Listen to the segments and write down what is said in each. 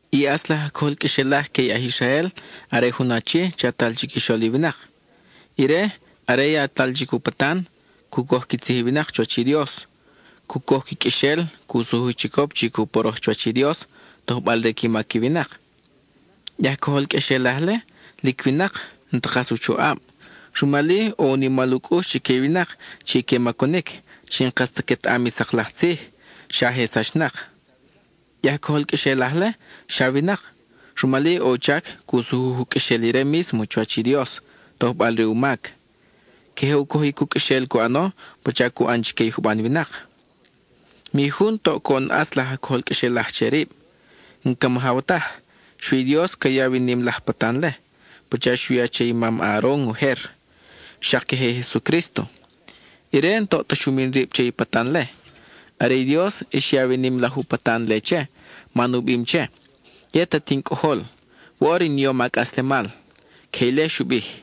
I ʼatz laj aj cojol qʼuexelaj que i aj Israel are jun achi chatal chiquixol i winak. Ire, are yatal chic u patan, cu coj qui tzij i winak chuwach i Dios, cu coj qui qʼuexel, cu sujuj chicop chi cu poroj chuwach i Dios, tojbal re qui mac i winak. I aj cojol qʼuexelaj-le, lic winak, n-ta kas u choʼab; rumal-i ʼo u nimal u cʼux chique i winak chi que macunic, chi n-kas ta quetaʼam i sak laj tzij, xa je sachnak. I aj cojol qʼuexelaj-le, xa winak, rumal-i ʼo u chac cu sujuj u qʼuexel ire mísmo chuwach i Dios, tojbal re u mac; queje u cojic u qʼuexel cu ʼano pacha cu ʼan chique i juban winak. Mi jun toʼ coʼon ʼatz laj aj cojol qʼuexelaj che rib; n-ca majaw taj. Xui i Dios ca yaw i nim laj patan-le, pacha xu ya che i mam Aaron ujer. Xak queje i Jesucrísto. Ire n-toʼ ta xu min rib che i patan-le, are i Dios xyaw i nim laj u patan-le che, man u bim che: Yet at in Cʼojol; woʼor in yom a cʼaslemal. (Queje ile xu bij.)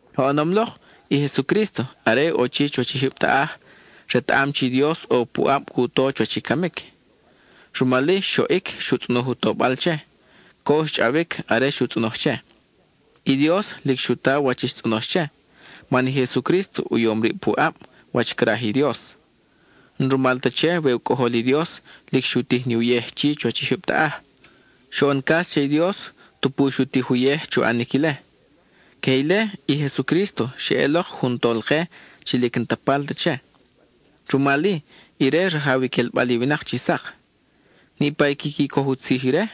Oʼonom lok, i Jesucrísto are ʼo chi chuwach i jyub taʼaj, retaʼam chi i Dios ʼo puʼab cu to chuwach i camic. Rumal-i, xoʼic xu tzʼonoj u tobal che; co xchʼawic are xu tzʼonoj che. I Dios lic xu ta wach i xtzʼonox che, man i Jesucrísto u yom rib puʼab, wach craj i Dios. N-rumal ta che we u Cʼojol i Dios, lic xu tij ni uyej chi chuwach i jyub taʼaj; xoʼon cas che i Dios, tupu xu tij uyej chu ʼanic ile. Queje ile, i Jesucrísto xeʼelok jun Tolke chi lic n-ta palt che, rumal-i, ire rajaw i quelbal i winak chi sak. Niʼpa i quiqui coj u tzij ire,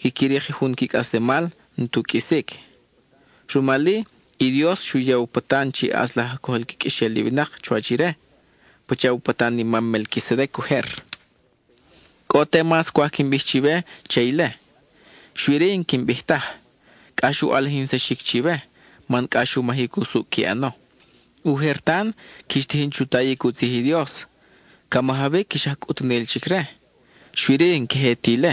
quiqui rik jun qui cʼaslemal n-tu qʼuisic. Rumal-i, i Dios xu ya u patan chi ʼatz laj aj cojol qui qʼuexel i winak chuwach ire, pacha u patan i mam Melquisedec ujer. Cʼo te mas cwaj quin bij chiwe che ile, xui-ri, n-quin bij taj; cʼax u ʼalijinsaxic chiwe, man cʼax u majic usucʼ qui ʼano. Ujer tan, quix tijin chu tayic u tzij i Dios; ca majawic ix aj cʼutunel chic-re. Xui-ri, n-queje ti ile;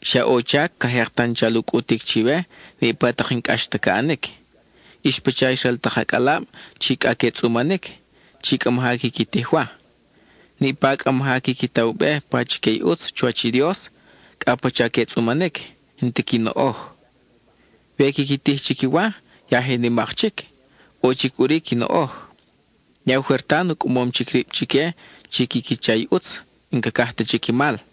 xa ʼo u chac ca jek tan chal u cʼutic chiwe niʼpa tak i n-cʼax ta ca ʼanic. Ix pacha ix ral tak acʼalab chi cʼa que tzʼumanic, chi cʼa maja quiqui tij wa. Ique chi cʼa maja quiqui ta u be pachique i ʼutz chuwach i Dios, cʼa pacha que tzʼumanic, n-ti qui noʼoj. We quiqui tij chic i wa, ya je nimak chic, ʼo chic ʼuri qui noʼoj. Ya ujer tan u cʼamom chic rib chique chi quiqui cha i ʼutz; n-cacaj ta chic i mal.